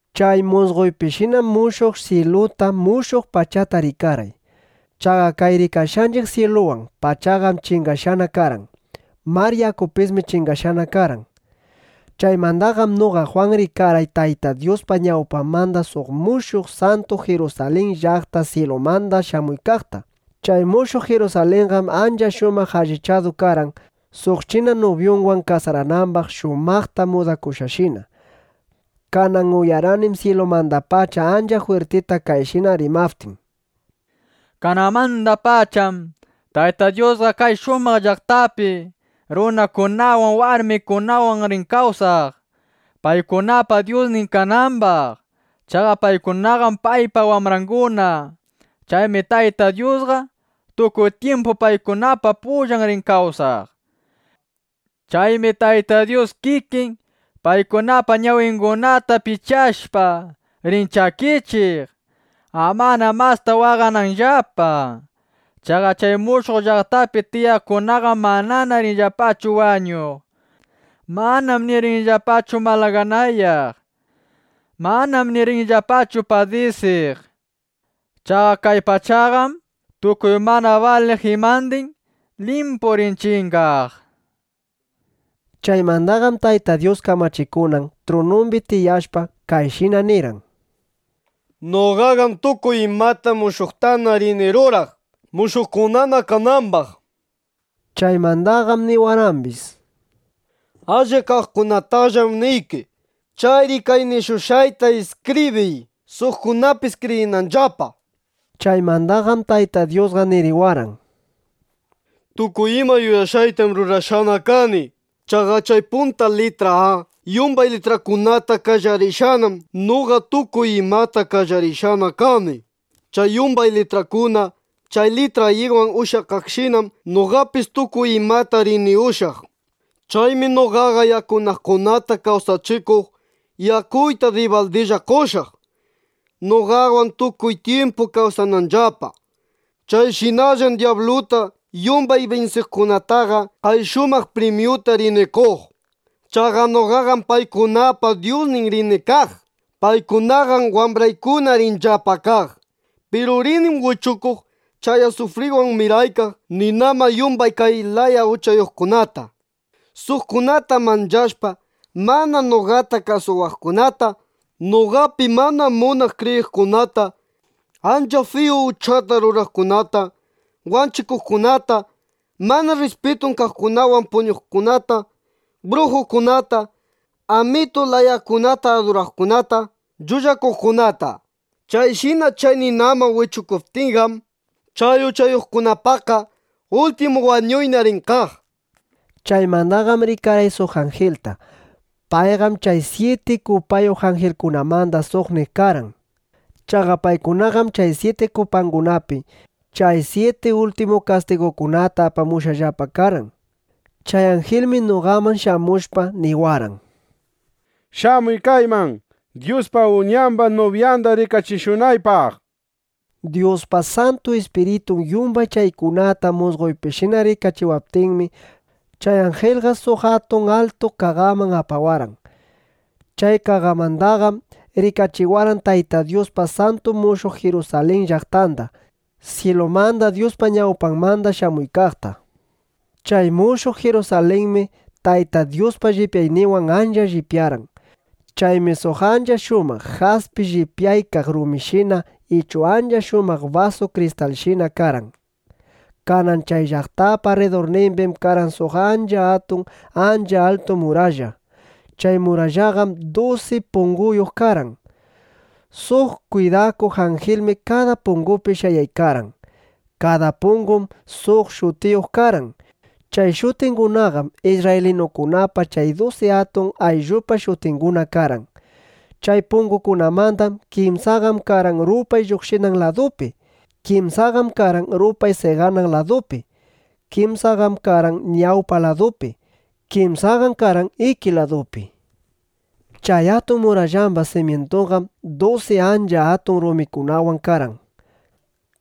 Chay musqoypishinam mushuq syiluta, mushuq pachata rikarqay. Chaqa kay rikashqanchiq syiluwan pachaqam chingashqana karqan. Mar yakupismi chingashqana karqan. Chaymandaqam noqa Jwan rikarqay Tayta Dyuspa ñawpanmanda suq mushuq santu Jirusalin llaqta syilumanda shamuykaqta. Chay mushuq Jirusalinqam ancha shumaq allichadu karqan, suq china nubyunwan kasaranambaq shumaqta mudakushqashina. Kanan uyarqanim syilumandapacha ancha jwirtita kayshina rimaptin: —Kananmandapacham Tayta Dyusqa kay shumaq llaqtapi runakunawan, warmikunawan rin kawsaq, paykunapa Dyusnin kanambaq. Chaqa paykunaqam paypa wambranguna. Chaymi Tayta Dyusqa, tukuy tyimpu paykunapa pullan rin kawsaq. Chaymi Tayta Dyus kikin paykunapa ñawingunata pichashpa, rin chakichiq, amana masta waqananllapa. Chaqa chay mushuq llaqtapi tiyaqkunaqam manana rinllapachu wañuq. Manam ni rinllapachu malaganayaq. Manam ni rinllapachu padisiq. Chaqa kay pachaqam tukuy mana baliq imandin limpu rin chingaq, nishpa. Chaymandaqam Tayta Dyus kamachikunan trunumbi tiyashpa, kayshina nirqan: —Noqaqam tukuy imata mushuqtana rini ruraq, mushuqkunana kanambaq, nishpa. Chaymandaqam niwarqambis: —Allip kaqkunatallam niyki. Chayri kay nishushqayta iskibriy, suqkunapis kriyinanllapa. Chaymandaqam Tayta Dyusqa niriwarqan: —Tukuy ima yuyashqaytam rurashqana kani. Chaqa chay punta litra “A” yumbay litrakunata qallariqshinam noqa tukuy imata qallarishqa kani. Chay yumbay litrakuna chay litra “Y”wan ushyakaqshinam noqapis tukuy imata rini ushyaq. Chaymi noqaqa yakunaqkunata kawsachikuq yakuyta dibaldilla qoshaq, noqawan tukuy tyimpu kawsananllapa. Chayshinallam dyabluta yumbay binsiqkunataqa kay shumaq primyuta rini qoq. Chaqa noqaqam paykunapa Dyusnin rini kaq. Paykunaqam wambraykuna rinllapa kaq. Piru rinim wichukuq chay asufriwan miraykaq ninaman yumbay kay laya uchayuqkunata: suqkunata manchashpa mana noqata kasuwaqkunata, noqapi mana munaq kriyiqkunata, ancha fiyu uchata ruraqkunata, wanchikuqkunata, mana rrispitun kaqkunawan puñuqkunata, brujukunata, amitu layakunata aduraqkunata, llullakuqkunata. Chayshina chay ninaman wichukuptiyqam, chay uchayuqkunapaqqa ultimu wañuyna rin kaq, nishpa. Chaymandaqam rikarqay suq anjilta. Payqam chay syiti kupayuq anjilkunamanda suqnin karqan. Chaqa paykunaqam chay syiti kupangunapi chay syiti ultimu kastigukunata apamushqallapa karqan. Chay anjilmi noqaman shamushpa, niwarqan: —Shamuy kayman Dyuspa Uñamba nubyanda rikachishunaqpaq, nishpa. Dyuspa Santu Ispiritun yumbay chaykunata musqoypishina rikachiwaptinmi, chay anjilqa suq atun altu qaqaman apawarqan. Chay qaqamandaqam rikachiwarqan Tayta Dyuspa santu mushuq Jirusalin llaqtanda, syilumanda Dyuspa ñawpanmanda shamuykaqta. Chay mushuq Jirusalinmi Tayta Dyuspa llipyayninwan ancha llipyarqan. Chaymi suq ancha shumaq jaspi llipyaykaq rumishina ichu ancha shumaq basu kristalshina karqan. Kanan chay llaqtapa rridurnimbim karqan suq ancha atun, ancha altu muralla. Chay murallaqam dusi punguyuq karqan. Suq kwidakuq anjilmi kada pungupi shayaykarqan. Kada pungum suq shutiyuq karqan. Chay shutingunaqam isrraylinukunapa chay dusi atun ayllupa shutinguna karqan. Chay pungukunamanda kimsaqam karqan rupay lluqshinan ladupi. Kimsaqam karqan rupay seqanan ladupi. Kimsaqam karqan ñawpa ladupi. Kimsaqam karqan iki ladupi. Chay atun murallamba simyintunqam dusi ancha atun rumikunawan karqan.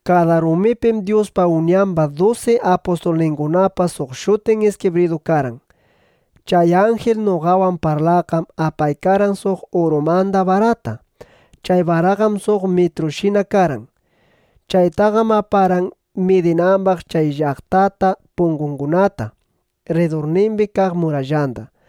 Kada rumipim Dyuspa Uñamba dusi apustulningunapa suq shutin iskibridu karqan. Chay anjil noqawan parlaqqam apaykarqan suq urumanda barata. Chay baraqam suq mitrushina karqan. Chaytaqam aparqan midinambaq chay llaqtata, pungungunata, rridurnimbi kaq murallanda.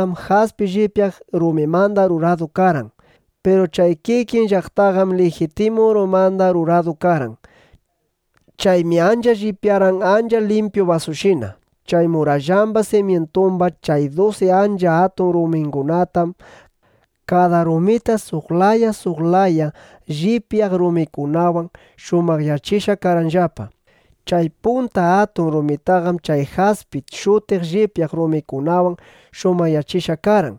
Chay llaqtapa murallanqam jaspi llipyaq rumimanda ruradu karqan. Piru chay kikin llaqtaqam lijitimu urumanda ruradu karqan. Chaymi ancha llipyarqan ancha limpyu basushina. Chay murallamba simyintumba chay dusi ancha atun rumingunatam kada rumita suq laya suq laya llipyaq rumikunawan shumaqyachishqa karqanllapa. Chay punta atun rumitaqam chay jaspi shutiq llipyaq rumikunawan shumaqyachishqa karqan.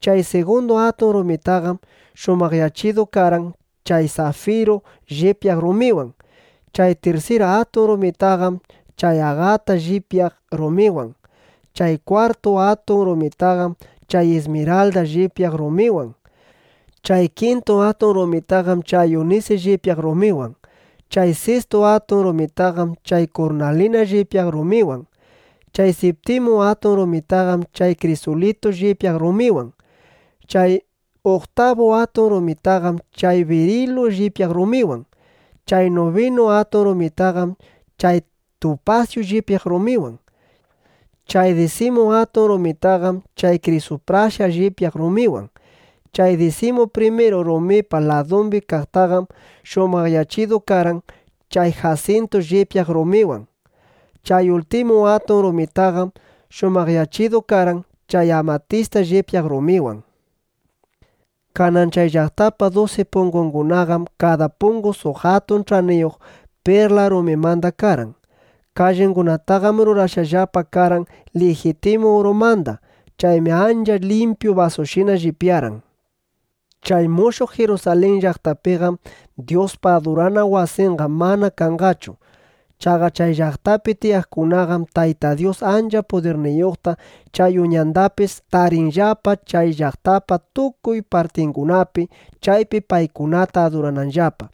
Chay sigundu atun rumitaqam shumaqyachidu karqan chay safiru llipyaq rumiwan. Chay tirsir atun rumitaqam chay agata llipyaq rumiwan. Chay kwartu atun rumitaqam chay ismiralda llipyaq rumiwan. Chay kintu atun rumitaqam chay unisi llipyaq rumiwan. Chay sistu atun rumitaqam chay kurnalina llipyaq rumiwan. Chay siptimu atun rumitaqam chay krisulitu llipyaq rumiwan. Chay uktabu atun rumitaqam chay birilu llipyaq rumiwan. Chay nubinu atun rumitaqam chay tupasyu llipyaq rumiwan. Chay disimu atun rumitaqam chay krisuprasa llipyaq rumiwan. Chay disimu primiru rumipa ladumbi kaqtaqam shumaqyachidu karqan chay jasintu llipyaq rumiwan. Chay ultimu atun rumitaqam shumaqyachidu karqan chay amatista llipyaq rumiwan. Kanan chay llaqtapa dusi pungungunaqam kada pungu suq atun ch'aniyuq perla rumimanda karqan. Kallingunataqam rurashqallapa karqan lijitimu urumanda. Chaymi ancha limpyu basushina llipyarqan. Chay mushuq Jirusalin llaqtapiqam Dyuspa adurana wasinqa mana kanqachu. Chaqa chay llaqtapi tiyaqkunaqam Tayta Dyus ancha pudirniyuqta chay Uñandapis tarinqallapa chay llaqtapa tukuy partingunapi, chaypi paykunata adurananllapa.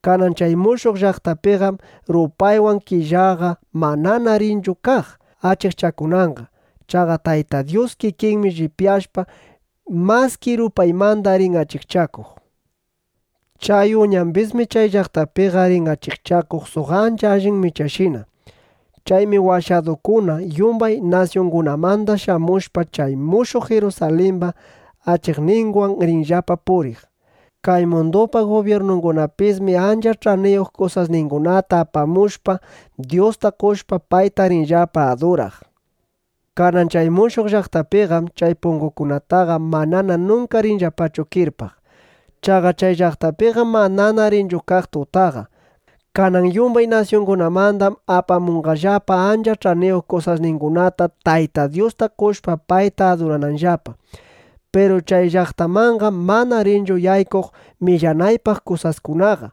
Kanan chay mushuq llaqtapiqam rupaywan killaqa manana rinchu kaq achikchakunanqa. Chaqa Tayta Dyus kikinmi llipyashpa, maski rupaymanda rin achikchakuq. Chay Uñambismi chay llaqtapiqa rin achikchakuq suq ancha allin michashina. Chaymi washadukuna yumbay nasyungunamanda shamushpa, chay mushuq Jirusalimba achikninwan rinllapa puriq. Kay mundupa gubyirnungunapismi ancha ch'aniyuq kusasningunata apamushpa, Dyusta qoshpa, payta rinllapa aduraq. Kanan chay mushuq llaqtapiqam chay pungungunataqa manana nunka rinllapachu kirpaq. Chaqa chay llaqtapiqam manana rinchu kaq tutaqa. Kanan yumbay nasyungunamandam apamunqallapa ancha ch'aniyuq kusasningunata, Tayta Dyusta qoshpa, payta adurananllapa. Piru chay llaqtamanqam mana rinchu yaykuq millanaypaq kusaskunaqa.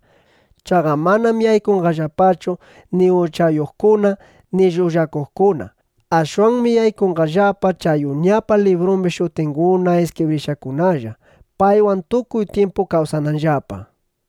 Chaqa manam yaykunqallapachu ni uchayuqkuna ni llullakuqkuna. Ashwanmi yaykunqallapaqa chay Uñapa librumbi shutinguna iskibrishqakunalla, paywan tukuy tyimpu kawsananllapa.